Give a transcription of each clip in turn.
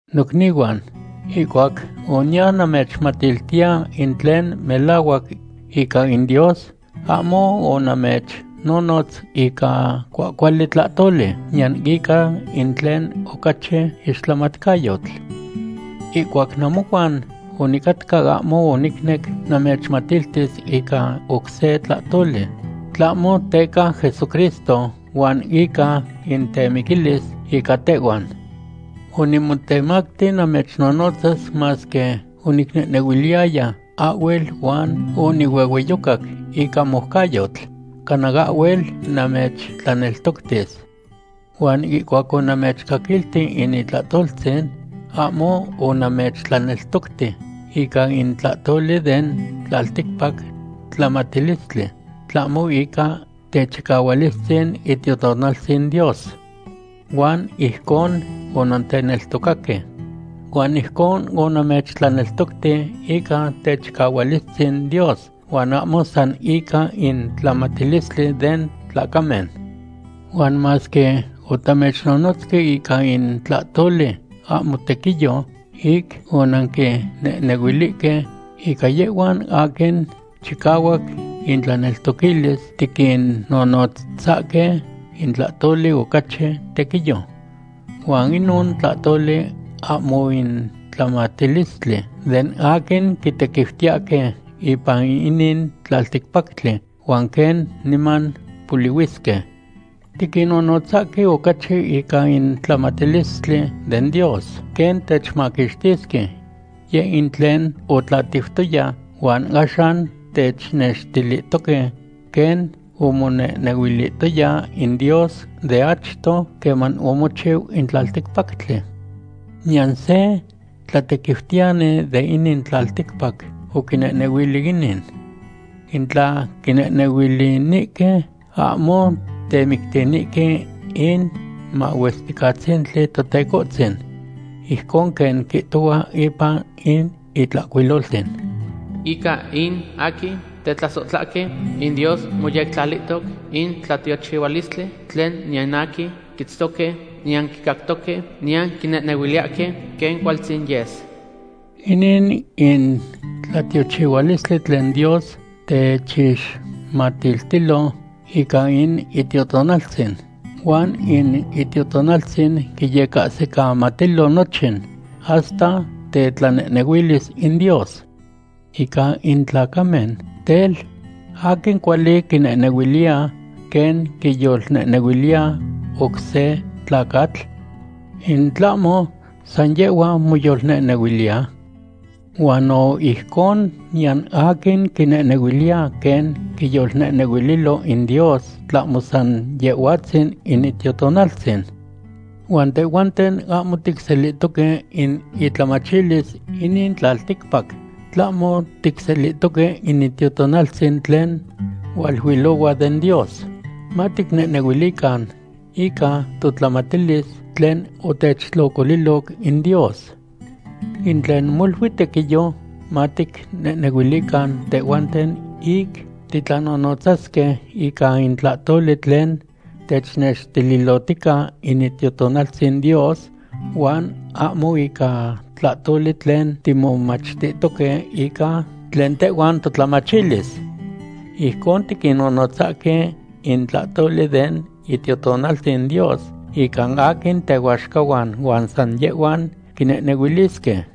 Nocnihuan, ihcuac oniya namechmatiltiya in tlen melahuac ica in Dios, ahmo onamechnonotz ica cuahcuali tlahtoli, niyan ica in tlen ocachi ixtlamatcayotl. Ihcuac namohuan onicatca ahmo onicnec namechmatiltis ica oc se tlahtoli, tlahmo teca Jesucristo, huan ica in temiquilis ica tehhuan. Onimotemacti namechnonotzas masque onicnehnehuiliyaya ahhuel huan onihuehueyocac ica moucayotl, cana ahhuel namechtlaneltoctis. Huan ihcuac onamechcaquilti in itlahtoltzin, ahmo onamechtlaneltocti ica in tlahtoli den tlalticpac tlamatilistli, tlahmo ica techicahualistzin Itiotonaltzin Dios. Huan ijcon onanteneltocaque. Huan ijcon onamechtlaneltocti ica techicahualistzin Dios huan ahmo san ica in tlamatilistli den tlacamen. Huan masque otamechnonotzque ica in tlahtoli ahmo tequiyo ic onanquinehnehuilihque, ica yehhuan aquin chicahuac intlaneltoquilis tiquinnonotzahque in tlahtoli ocachi tequiyo. Huan inon tlahtoli ahmo in tlamatilistli den aquin quitequiutiyahque ipan inin tlalticpactli huan quen niman polihuisque. Tiquinnonotzahque ocachi ica in tlamatilistli den Dios, quen techmaquixtisque. Yeh in tlen otlatiutoya huan axan technextilihtoque, quen omonehnehuilihtoya in Dios de achto queman omochiu in tlalticpactli. Niyan se tlatequiutiyani de inin tlalticpac oquinehnehuili inin. In tla quinehnehuilinihque, ahmo temictinihque in Mahuesticatzintli Totecohtzin. Ijcon quen quihtohua ipan in Itlahcuiloltzin: Ica in aquin tetlasohtlahque, in Dios moyectlalihtoc in tlatiochihualistli tlen niyan aquin quitztoque, niyan quicactoque, niyan quinehnehuiliyahque quen cualtzin yes. Inin in tlatiochihualistli tlen Dios techixmatiltilo ica in Itiotonaltzin, huan in Itiotonaltzin quiyecahsicamatilo nochin, hasta tetlanehnehuilis in Dios. Ica in tlacamen, tel, ¿aquin cuali quinehnehuiliya quen quiyolnehnehuiliya oc se tlacatl? ¿In tlahmo san yehhua moyolnehnehuiliya? Huan no ijcon niyan aquin quinehnehuiliya quen quiyolnehnehuililo in Dios tlahmo san Yehhuatzin in Itiotonaltzin. Huan tehhuanten ahmo ticselihtoque in itlamachilis inin tlalticpac, tlahmo ticselihtoque in Itiotonaltzin tlen hualuilohua den Dios, maticnehnehuilican ica totlamatilis tlen otechtlocoliloc in Dios. In tlen molui tequiyo maticnehnehuilican tehhuanten ic titlanohnotzasque ica in tlahtoli tlen technextililotica in Itiotonaltzin Dios huan ahmo ica tlahtoli tlen timomachtihtoque ica tlen tehhuan totlamachilis. Ijcon tiquinnonotzahque in tlahtoli den Itiotonaltzin Dios ica aquin tehuaxcahuan, huan san yehhuan quinehnehuilisque.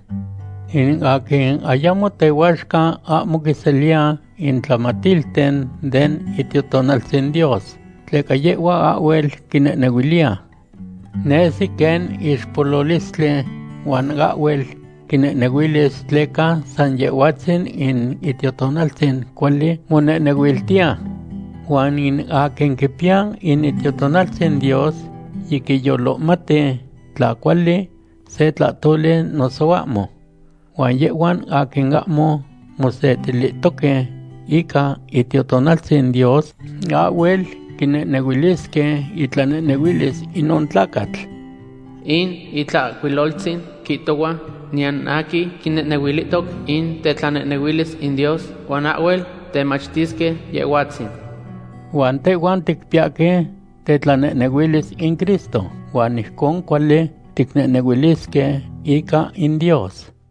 In aquin ayamo tehuaxca ahmo quiseliya in tlamatilten den Itiotonaltzin Dios, tleca yehhua ahhuel quinehnehuiliya. Nesi quen ixpololistli huan ahhuel quinehnehuilis tleca san Yehhuatzin in Itiotonaltzin cuali monehnehuiltiya. Huan in aquin quipiya in Itiotonaltzin Dios yiquiyolohmati tla cuali se tlahtoli noso ahmo. Huan yehhuan aquin ahmo mosetilihtoque ica Itiotonaltzin Dios ahhuel quinehnehuilisque itlanehnehuilis inon tlacatl. In Itlahcuiloltzin quihtohua: “Niyan aquin quinehnehuilihtoc in tetlanehnehuilis in Dios huan ahhuel temachtisque Yehhuatzin.” Huan tehhuan ticpiyahque tetlanehnehuilis in Cristo, huan ijcon cuali ticnehnehuilisque ica in Dios.